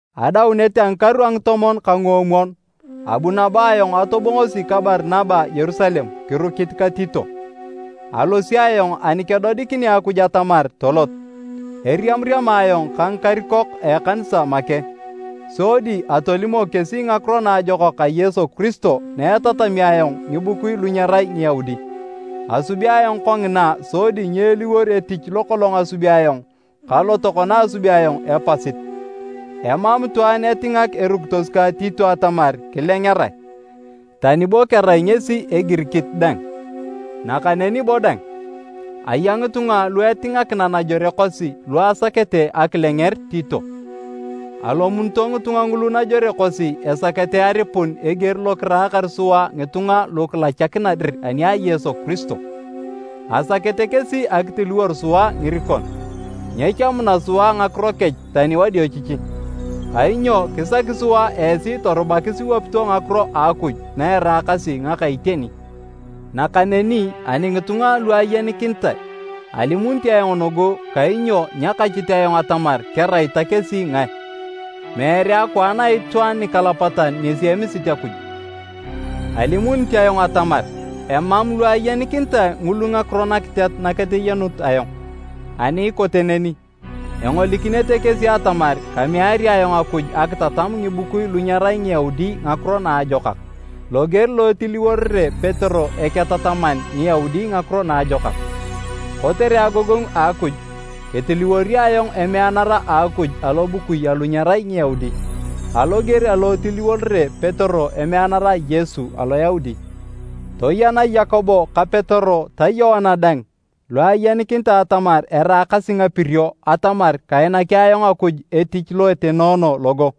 Adaunet a ngikaru a ngitomon ka nguomwon abu nabo ayong atobongosi ka Barinaba Yerusalem, kirukit ka Tito. Alosi ayong ani kedodikinea Akuj atamar tolot. Eriamariama ayong ka ngikarikok a ekanisa make, sodi atolimok kesi Ngakiro Naajokak a Yesu Kiristo na etatami ayong ngibukui lu nyerai Ngiyaudi. Asubi ayong kongina sodi nyeeliwor etich lokolong asubi ayong ka lo tokona asubi ayong epasit. Emam itwaan etingak erukitos kang Tito atamar kilengerae, tani bo kerai ngesi Egirikit dang, nakaneni bo dang, aya ngitunga lu etingakina najore kosi lu asakete akilenger Tito. Alomunito ngitunga ngulu najore kosi esakete aripun eger lo kiraakar sua ngitunga lu kilachakina dir ani a Yesu Kiristo. Asakete kesi akitiliwor sua ngirikon, nyechamuna sua ngakiro kech tani wadiochichi, kainyo kisaki sua esi torubakis iwapito ngakiro a Akuj na eraakasi ngaka iteni. Nakaneni ani ngitunga lu ayenikinitae, alimunit ayong nugu kainyo nyakachit ayong atamar kerai ta kesi ngae, meere akwaan a itwaan nikalapatan ngesi emisit Akuj. Alimunit ayong atamar emam lu ayenikinitae ngulu ngakiro nakiteat naketeyenut ayong. Ani ikote neni, engolikinete kesi atamar kameari ayong Akuj akitatam ngibukui lu nyerai Ngiyaudi Ngakiro Naajokak, loger lo etiliworere Petero eketataman Ngiyaudi Ngakiro Naajokak. Kotere agogongu a Akuj, ketiliworio ayong emeanara a Akuj alobukui alu nyerai Ngiyaudi, aloger alo etiliworere Petero emeanara a Yesu Aloyaudi. Toyena Yakobo ka Petero ta Yoana dang lu ayeninikitae atamar eraakasi ngapirio atamar kainaki ayong Akuj etich lo etenoono logo.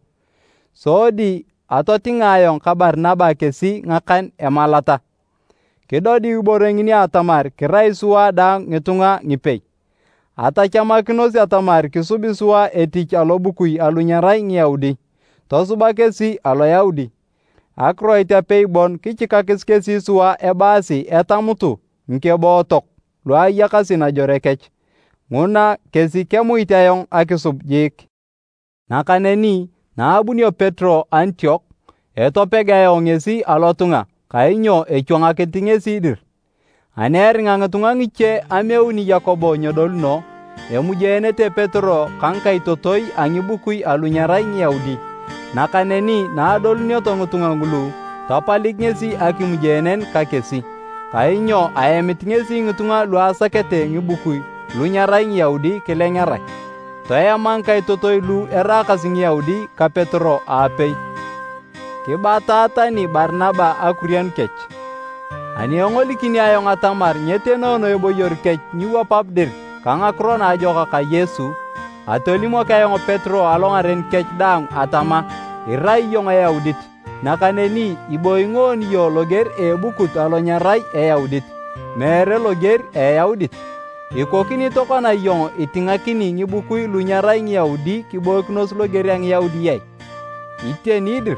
Sodi atotinga ayong ka Barinaba kesi ngakan emalata, kidodiu ibore ngini atamar kirai sua daang ngitunga ngipei. Atachamakinos atamar kisubi sua etich alobukui alu nyerai Ngiyaudi, tosuba kesi Aloyaudi. Akiroit apei bon kichikakis kesi sua ebaasi etamutu ngikebootok lu ayakasi najore kech, nguna kesi kemuit ayong akisub jiik. Nakaneni naabunio Petero Antiok, etopeg ayong ngesi alotunga kainyo echwangakinit ngesi dir. Ani eringa ngitunga ngiche ameuni Yakobo nyedoluno, emujeenete Petero ka ngikaitotoi a ngibukui alu nyerai Ngiyaudi. Nakaneni naadoluneto ngitunga ngulu, tapalik ngesi akimujeenen ka kesi, kainyo aemit ngesi ngitunga lu asakete ngibukui lu nyerai Ngiyaudi kilengerae. Toema ngikaitotoi lu eraakasi Ngiyaudi ka Petero aapei, kibata tani Barinaba akurianu kech. Ani engolikini ayong atamar nyetenoono eboyor kech nyiwapap dir ka ngakiro naajokak a Yesu, atolimok ayong Petero alongaren kech daang atama, “Irai iyong Eyaudit, nakaneni ibooyi ngoon iyong loger a ebukut alo nyerai Eyaudit, meere loger a Eyaudit. Ikokini tokona iyong itingakini ngibukui lu nyerai Ngiyaudi kiboikinos loger a Ngiyaudi ai?” Iteni dir,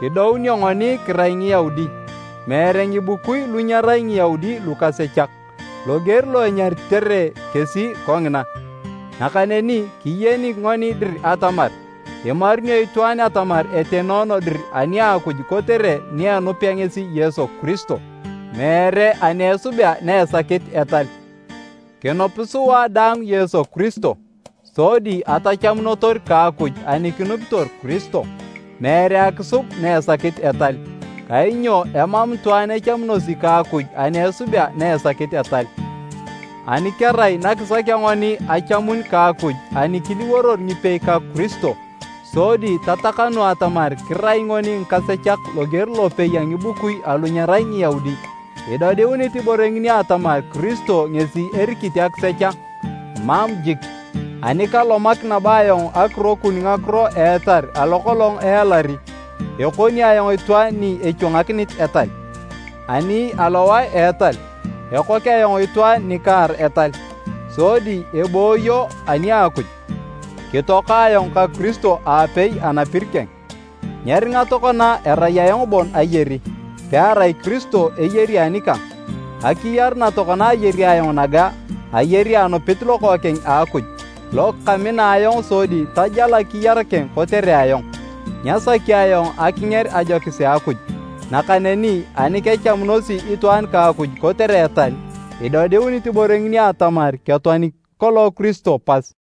kidounio ngoni kirai Ngiyaudi, meere, “Ngibukui lu nyerai Ngiyaudi lukasechak,” loger lo enyaritere kesi kongina. Nakaneni kiyeni ngoni dir atamar imarunio itwaan atamar etenoono dir ani a Akuj kotere ni enupea ngesi Yesu Kiristo, meere ani esubea na esakit etal. Kinup sua dang Yesu Kiristo sodi atachamunotor ka Akuj ani kinupitor Kiristo, meere akisub na esakit etal. Kainyo emam itwaan echamunosi ka Akuj ani esubea na esakit etal. Ani kerai nakisakea ngoni achamun ka Akuj ani kiliworor ngipei ka Kiristo, sodi tatakanu atamar kirai ngoni ngikasechak loger lopei a ngibukui alu nyerai Ngiyaudi, idodiunit ibore ngini atamar Kiristo ngesi erikit akisech a? Mam jik! Ani kalomak nabo ayong akirokun ngakiro a etal alo kolong ealari, ekoni ayong itwaan ni echwangakinit etal. Ani alowae alo etal, ekok ayong itwaan nikaar etal, sodi ebooyo ani a Akuj. Kitoaka ayong ka Kiristo aapei anapir keng. Nyeringa tokona erai ayong bon ayari, pearai Kiristo eyari anikang. Akiyar na tokona ayari ayong naga, ayari anupit Lokookeng a Akuj, lo kamina ayong sodi tajal akiyar keng kotere ayong. Nyasaki ayong akinger ajokis a Akuj. Nakaneni ani kechamunosi itwaan ka Akuj kotere etal, idodiunit ibore ngini atamar ketoani kolong Kiristo pas!